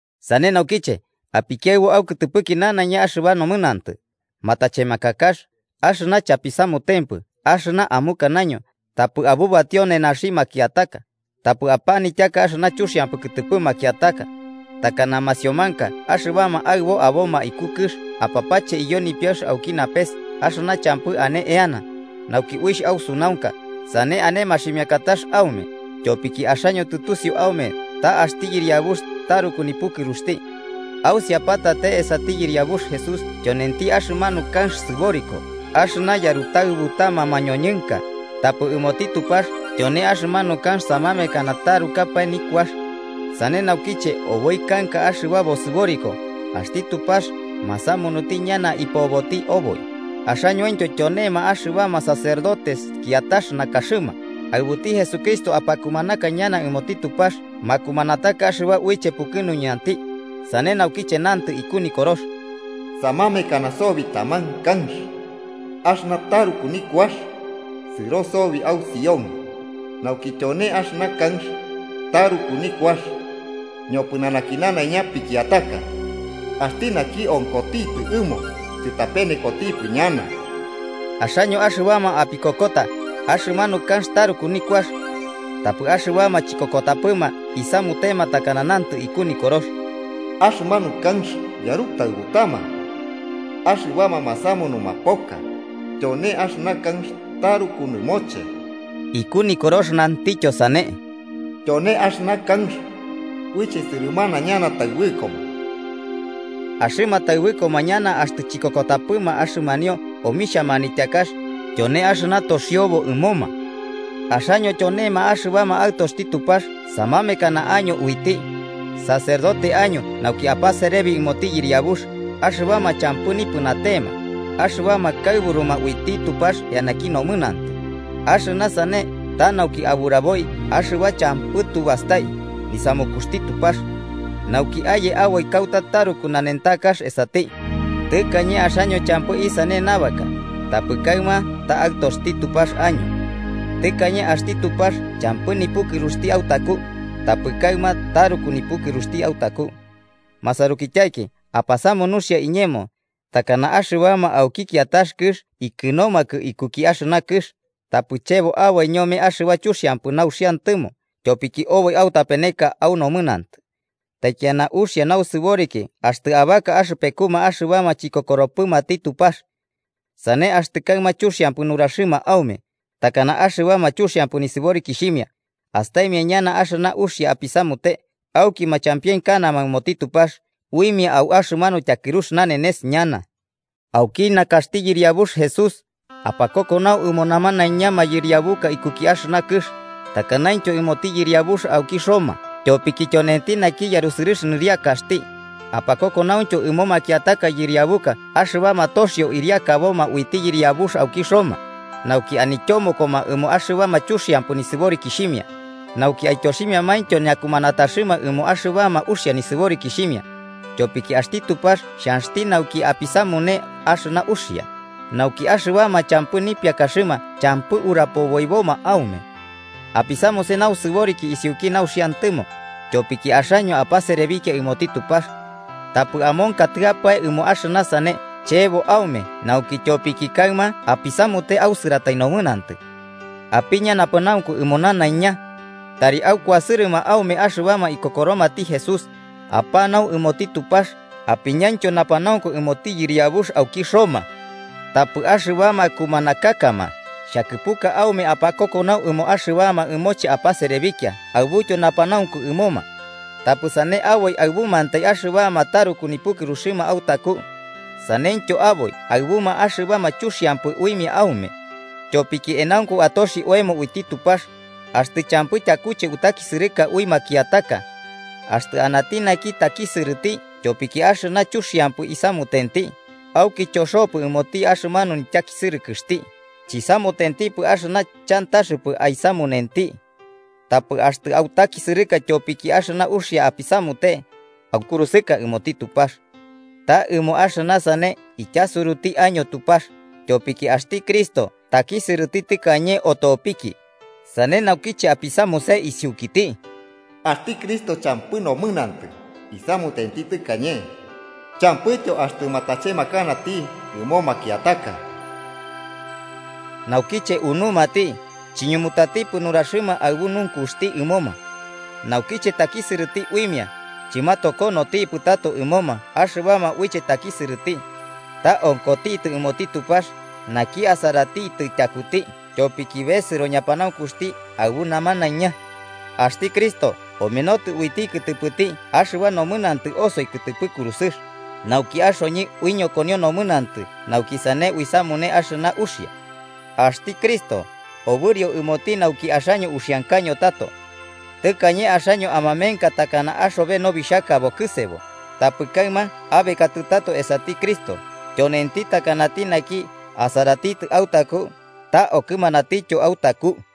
Sane naukiche, apikiaɨbu aukɨtɨpɨki nanaiña axɨba nomɨnantɨ, matachemakakax, axɨna chapisamutempɨ axɨna amukanaño, tapɨ abubatio nenaxi makiataka, tapɨ apanityaka axɨna chuxiampɨ kɨtɨpɨ makiataka. Takana masiomanka axɨbama aɨbo aboma iku kɨx, apapache iyo nipiaɨx auki napes axɨna champɨ ane eana, nauki uixh ausunaunka sane ane maximiakatax aume, tyopiki axaño tɨtusiu aume ta axti Yɨriabux taruku nipukɨruxti. Ausiapatate, esati Yɨriabux Jesús, tyonenti axɨmanu kanx sɨboriko axɨna yarutaɨbutama mañoñɨnka, tapɨ ɨmoti Tupax tyone axɨmanu kanx samamekana tarukapae nikuax. Sane naukiche, oboi kanka axɨba bosɨboriko, axti Tupax masamunuti ñana ipoboti aboi, axañointyo tyonema axɨbama sacerdotes kiatax nakaxɨma, aɨbuti Jesucristo apakumanaka ñana ɨmoti Tupax makumanataka axɨba uiche pukɨnuñati. Sane naukiche nantɨ iku Nikorox: “Samamekana sobi taman kanx axɨna taruku nikuax, sɨro sobi au Sión, nauki tyone axɨna kanx taruku nikuax ñopɨnanaki nanaiña pikiataka. Axti naki onkotitɨ ɨmo, chɨtapenekotipɨ ñana.” Axaño axɨbama apikokokata, axɨmanu kanx taruku nikuax. Tapɨ axɨbama chikokotapɨma isamutema takana nantɨ iku Nikorox: “Axɨmanu kanx yarutaɨbutama axɨbama masamunuma poka, tyone axɨna kanx taruku nɨmoche.” Iku Nikorox nantityo Sane: “Tyone axɨna kanx uiche sɨrɨmanama ñana taɨbɨkoma.” Axɨma taɨbɨkoma ñana axtɨ chikokotapɨma axɨmanio omixhia manityakax: tyone axɨna toxiobo ɨmoma. Axaño tyonema axɨbama aɨtoxti Tupax samamekana año uiti, sacerdote año nauki apaserebi ɨmoti Yɨriabux, axɨbama champɨ nipɨnatema, axɨbama kaɨburuma uiti Tupax eanaki nomɨnantɨ. Axɨna sane ta nauki aburaboi axɨba champɨ tu bastai nisamukuxti Tupax, nauki aye aboi kauta taruku nanentakax esati. Tɨkañe axaño champɨ isane nabaka, tapɨ kaɨma ta aɨtoxti Tupax año. Tɨkañe axti Tupax champɨ nipukɨruxti autaku, tapɨ kaɨma taruku nipukɨruxti autaku. Masarukityaiki, apasamu nuxia iñemo, takana axɨbama auki kiatax kɨx ikɨnomakɨ ikuki axɨna kɨx, tapɨ chebo aboi ñome axɨba chuxiampɨ nauxiantɨmo tyopiki oboi autapeneka au nomɨnantɨ. Taikiana uxia nausɨboriki axtɨ abaka axɨpekuma axɨbama chikokoropɨmati Tupax. Sane axtɨ kaɨma chuxiampɨ nuraxɨma aume, takana axɨbama chuxiampɨ nisɨborikixhimia, astaimia ñana axɨna uxia apisamute auki machampienkanama ɨmoti Tupax uimia au axɨmanu tyakɨrux nanenes ñana. Auki nakaxti Yɨriabux Jesús, apakokonau ɨmo namanaiña mayɨriabuka ikuki axɨna kɨx: takanaintyo ɨmoti yɨriabux auki Roma tyopiki tyonenti naki yarusɨrɨx nɨriakaxti, apakokonauntyo ɨmo makiataka yɨriabuka axɨbama toxio ɨriakaboma uiti yɨriabux auki Roma nauki anityomokoma ɨmo axɨbama chuxiampɨ nisɨborikixhimia, nauki aityoximiamaintyo ñakumanataxɨma ɨmo axɨbama uxia nisɨborikixhimia. Tyopiki axti Tupax xhanxti nauki apisamune axɨna uxia, nauki axɨbama champɨ nipiakaxɨma champɨ urapoboiboma aume. Apisamuse nausɨboriki isiuki nauxiantɨmo, tyopiki axaño apaserebikia ɨmoti Tupax. Tapɨ amonkatɨapae ɨmo axɨna sane chebo aume nauki tyopiki kaɨma apisamute ausɨratai nomɨnantɨ. Apiña napanaunku ɨmo namanaiña. Tari akuasɨrɨma aume axɨbama ikokoromati Jesús, apanau ɨmoti Tupax, apiñaintyo napanaunku ɨmoti yɨriabux auki Roma. Tapɨ axɨbama kumanakakama xhakɨpuka aume apakokonau ɨmoma axɨbama ɨmoche apaserebikia aɨbutyo napanaunku ɨmoma. Tapɨ sane aboi aɨbumantai axɨbama taruku nipukɨruxɨma autaku, saneityo aboi aɨbuma axɨbama chuxiampɨ uimia aume. Tyopiki enaunku atoxi oemo uiti Tupax axtɨ champɨ tyakuche utakisɨrɨka ui makiataka. Axtɨ anati naki takisɨrɨti tyopiki axɨna chuxiampɨ isamutenti, auki choxopɨ ɨmoti axɨmanu nityakisɨrɨkɨxti, chisamutentipɨ axɨna chantaxɨpɨ aisamunenti. Tapɨ axtɨ autakisɨrɨka tyopiki axɨna uxia apisamute, aukurusɨka ɨmoti Tupax. Ta ɨmo axɨna sane ityasuruti año Tupax, tyopiki axti Cristo takisɨrɨti tɨkañe otopiki, sane nauki apisamune isiukiti. Axti Cristo champɨ nomɨnantɨ isamutenti tɨkañe champɨityo axtɨ matachemakanati ɨmo makiataka. Naukiche unumati, chiñumutatipɨ nuraxɨma aɨbu nunkuxti ɨmoma. Naukiche takisɨrɨti uimia, chɨmatokonotipɨ tato ɨmoma axɨbama uiche atakisɨrɨti. Ta onkotitɨ ɨmoti Tupax, naki asaratitɨ tyakuti tyopiki besɨro ñapanaunkuxti aɨbu namanaiña. Axti Cristo omenotɨ uiti kɨtɨpɨti axɨba nomɨnantɨ osoi kɨtɨpɨ kurusɨx, nauki axoñɨ uiñokonio nomɨnantɨ nauki sane uisamune axɨna uxia. Axti Cristo obɨrio ɨmoti nauki axaño uxiankaño tato. Tɨkañe axaño amamenka takana axobe nobixhaka bokɨsebo, tapɨ kaɨma abekatɨ tato esati Cristo, tyonenti takanati naki asaratitɨ autaku ta okɨmanatityo autaku.